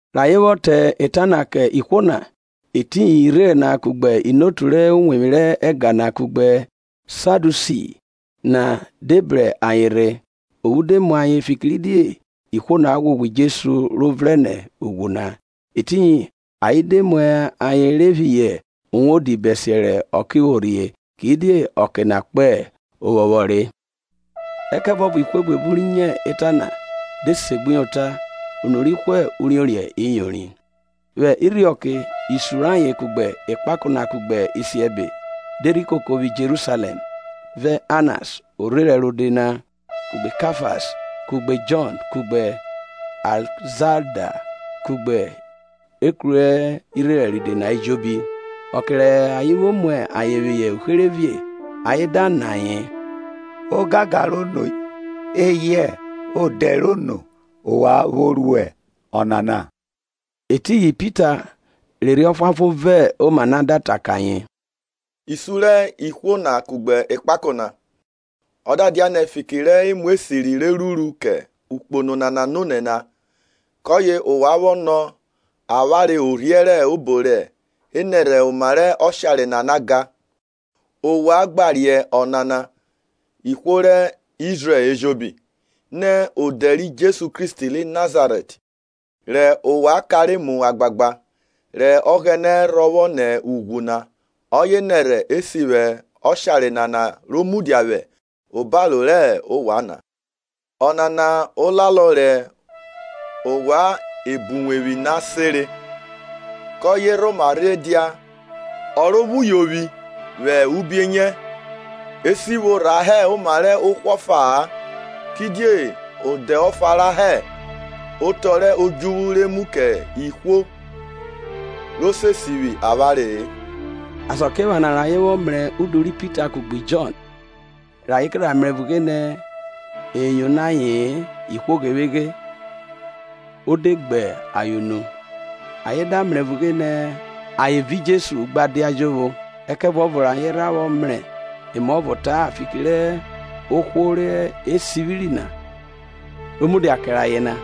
Rẹ ayen vwọ ta eta na kẹ ihwo na, etiyin irherẹn na kugbe inotu rẹ uwevwi rẹ ẹga na kugbe Sadiusi na de bro ayen rhe, ophu de mu ayen fikiridie ihwo na ghwoghwo Jesu ro vrẹn nẹ ughwu na. Etiyin ayen de mu ayen phihọ uwodi bẹsiẹ rẹ ọke vwo rhie, kidie ọke na kpo ovwọnvwọn re. Ẹkẹvuọvo ihwo buebu ri nyo ota na de segbuyota; unu rẹ ihwo uriorin iyorin. Vwẹ irhiọke isun rayen kugbe ekpako na kugbe isiẹbe na de rhi koko vwi Jerusalẹm, vẹ Annas orherẹn rode na kugbe Kafas kugbe Jọn kugbe Alẹzanda kugbe ekru rẹ orherẹn rode na ejobi. Ọke rẹ ayen vwo mu ayen phihọ uherevie, ayen da nọ ayen, Ogangan rẹ ono eyẹ odẹ rẹ ono ovwan vwo ru ọnana? Etiyin Pita rẹ Erhi Ọfuanfon vọn oma na, da ta kẹ ayen, Isun rẹ ihwo na kugbe ekpako, ọ da dianẹ fiki rẹ emu esiri re ruru kẹ okpono nana nonẹ na, kọye ovwan vwọ nọ avwanre orhiẹn rẹ obo re nẹrhẹ oma rẹ oshare nana gan, ovwan gba riẹn ọnana ihwo rẹ Izrẹl ejobi, nẹ odẹ ri Jesu Kristi ri Nazarẹt, rẹ ovwan kanre mu agbagba, rẹ Ọghẹnẹ rhọvwọ nẹ ughwu na, ọye nẹrhẹ e sivwi ọshare nana ro mudia vwẹ obaro rẹ ovwan na. Ọnana olalọ rẹ ovwan ebọuwevwi na senre kọye rhoma rhe dia ọrovwuyovwi vwẹ ubienyẹ. Esivwo rha hẹ oma rẹ ohwo ofa-a, kidie odẹ ọfa rha hẹ otọ rẹ odjuvwu re mu kẹ ihwo ro se sivwi avwanre-e. Asakiephana rẹ ayen vwọ mrẹ udu ri Pita kugbe Jọn, rẹ ayen ke rha mrẹ vughe nẹ e yono aye-en, nẹ ayen ihwo ghevweghe, o de gbe ayen unu; ayen da mrẹ vughe nẹ ayen vi Jesu gba dia jovwo. Ẹkẹvuọvo rẹ ayen rha mrẹ emuọvọ ta-a fiki rẹ ohwo re sivwiri na ro mudia kẹrẹ ayen na,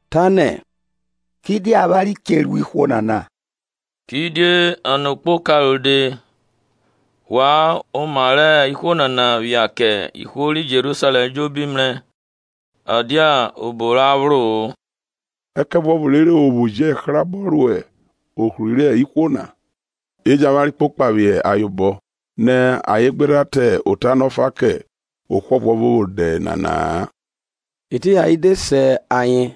ta ne, Kidie avwanre che ru ihwo nana? Kidie nẹ okpoka rode wan oma rẹ ihwo nana phia kẹ ihwo ri Jerusalẹm ejobi mrẹ, ọ dia obo ra phro-o. Ẹkẹvuọvo rere o vwo jẹ hrabọ ro ohri rẹ ihwo na, e jẹn avwanre kpokpa phihọ ayen obọ nẹ ayen gbe ta ota na ọfa kẹ ohwo ọvuọvo vwẹ odẹ nana-a. Etiyin ayen de se ayen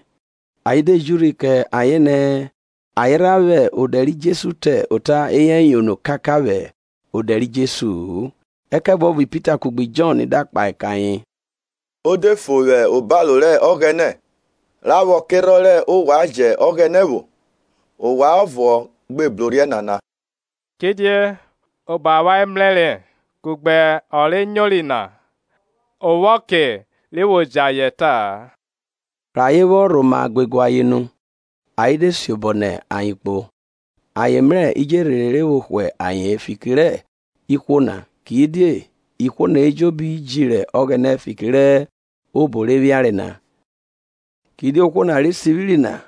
ayen de ji urhi kẹ ayen nẹ ayen rha vwẹ odẹ ri Jesu ta ota eyẹ yono kakaka vwẹ odẹ ri Jesu-u. Ẹkẹvuọvo Pita kugbe Jọn da kpahe kẹ ayen, o de fo vwẹ obaro rẹ Ọghẹnẹ ra vwo kerhọn rẹ ovwan jẹ Ọghẹnẹ vwo, ovwan ọvo gbe brorhiẹ nana. Kidie obo rẹ avwanre mrẹre kugbe ọ rẹ nyori na o vwo ọke re vwọ jẹ ayen ẹta-a. Rẹ ayen vwọ rhoma guegue ayen nu, ayen de siobọ nẹ ayen kpo, ayen mrẹ idjerhe rẹ vwo hwe aye-en, fiki rẹ ihwo na; kidie ihwo na ejobi jiri Ọghẹnẹ fiki rẹ obo re phiare na. Kidie ohwo na re sivwiri na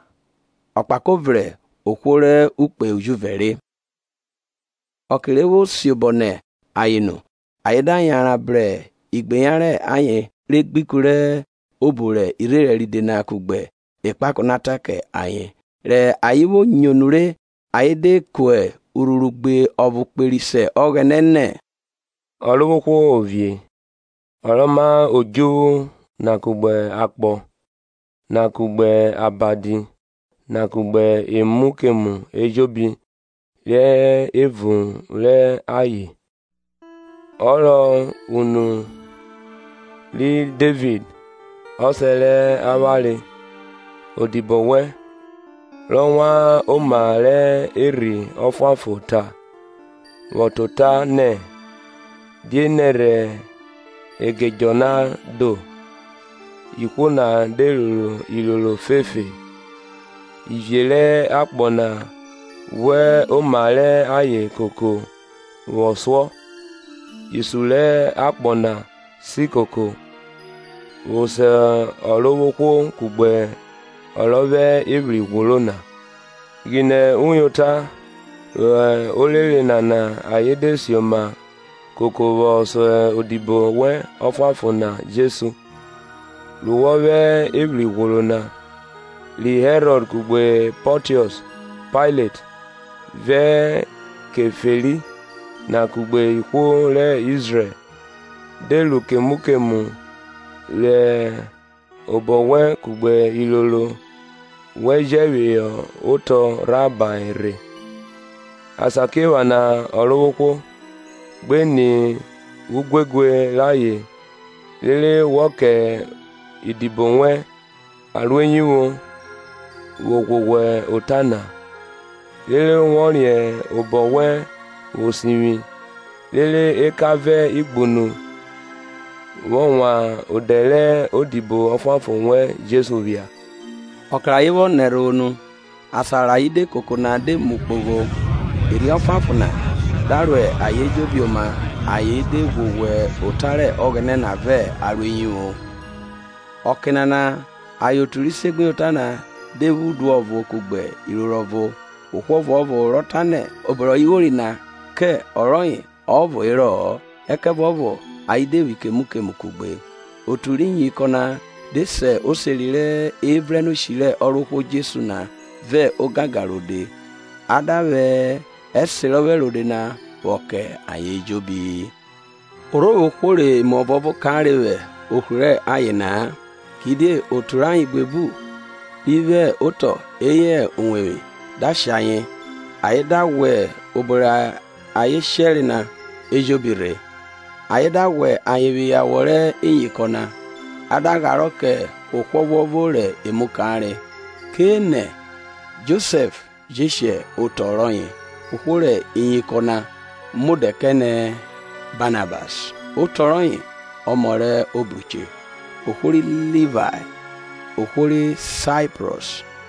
ọkpako vrẹ ohwo rẹ ukpe ujuvẹ re. Ọke re vwo siobọ nẹ ayen nu ayen da yanran bru igbeyan rẹ ayen re gbe ikun rẹ obo rẹ irherẹn ride na kugbe ekpako na ta kẹ ayen. Rẹ ayen vwo nyo nure, ayen de ku urhuru gbe ọvo kperi se Ọghẹnẹ nẹ, Ọrovwohwo Ovie, ọ rọ ma odjuvwu na kugbe akpọ na kugbe abadi na kugbe emu kemu ejobi re hẹ evun rẹ ayen, ọ rọ unu ri Devid ọsẹ rẹ avwanre, odibo wẹn, rọ wan oma rẹ Erhi Ọfuanfon vwọ ta ota nẹ, Die nẹrhẹ Egedjọ na do, ihwo na de roro iroro fefe? Iviẹ rẹ akpọ na ghwẹ oma rẹ ayen koko vwọ suọ, isun rẹ akpọ na si koko, vwọ so Ọrovwohwo kugbe ọ rọ vwẹ evwri ghworo na. Ghinẹ nyota vwẹ orere nana ayen de sioma koko vwọ so odibo wẹn ọfuanfon na Jesu, ru wọ vwẹ evwri ghworo na, ri Herọd kugbe Pọntiọs Pailet, vẹ Keferi na kugbe ihwo rẹ Izrẹl, de ru kemu kemu rẹ obọ wẹn kugbe iroro wẹn jẹ phihọ otọ rhahae rhe. Asakiephana Ọrovwohwo, gbe ni eguegue rayen, rere wọ kẹ idibo wẹn aroeyivwo vwo ghwoghwo ota na, rere wọ riẹn obọ wẹn vwo sivwi, rere eka vẹ igbunu vwọ wan odẹ rẹ odibo ọfuanfon wẹn Jesu phia. Ọke rẹ ayen vwọ nẹ ẹrhovwo nu, asan rẹ ayen de koko na de mu kpogho; Erhi Ọfuanfon na da ro ayen ejobi oma ayen de ghwoghwo ota rẹ Ọghẹnẹ na vẹ aroeyivwo. Ọke nana ayen otu ri segbuyota na de vwo udu ọvo kugbe iroro ọvo, ohwo ọvuọvo rọ tanẹ obo rẹ ọye vwori na kẹ ọ rọye ọvo herọ-ọ, ẹkẹviọvo ayen de vwo kemu kemu kugbe. Otu rẹ iyinkọn na de se oseri rẹ evrẹnnshi rẹ Ọrovwohwo Jesu na vẹ ogangan rode, a da vwẹ ẹserọphẹ rode na vwọ kẹ ayen ejobi. Ọ rhe vwo ohwo rẹ emu ọvuọvo kanre vwẹ ohri rẹ ayen na-a, kidie otu rẹ ayen buebu ri vwo otọ eyẹ iwevwi da shẹ ayen, ayen da ghwẹ obo rẹ ayen shẹre na ejobi rhe. Ayen da ghwẹ ayen phihọ awọ rẹ iyinkọn na; a da gharọ kẹ ohwo ọvuọvo rẹ emu kanre. Kẹ enẹ Josẹf je shẹ otọ rọye ohwo rẹ iyinkọn na mu odẹ kẹ nẹ Banabas (otọ rọye, Ọmọ rẹ obruche) ohwo ri Livae, ohwo ri Saiprọs,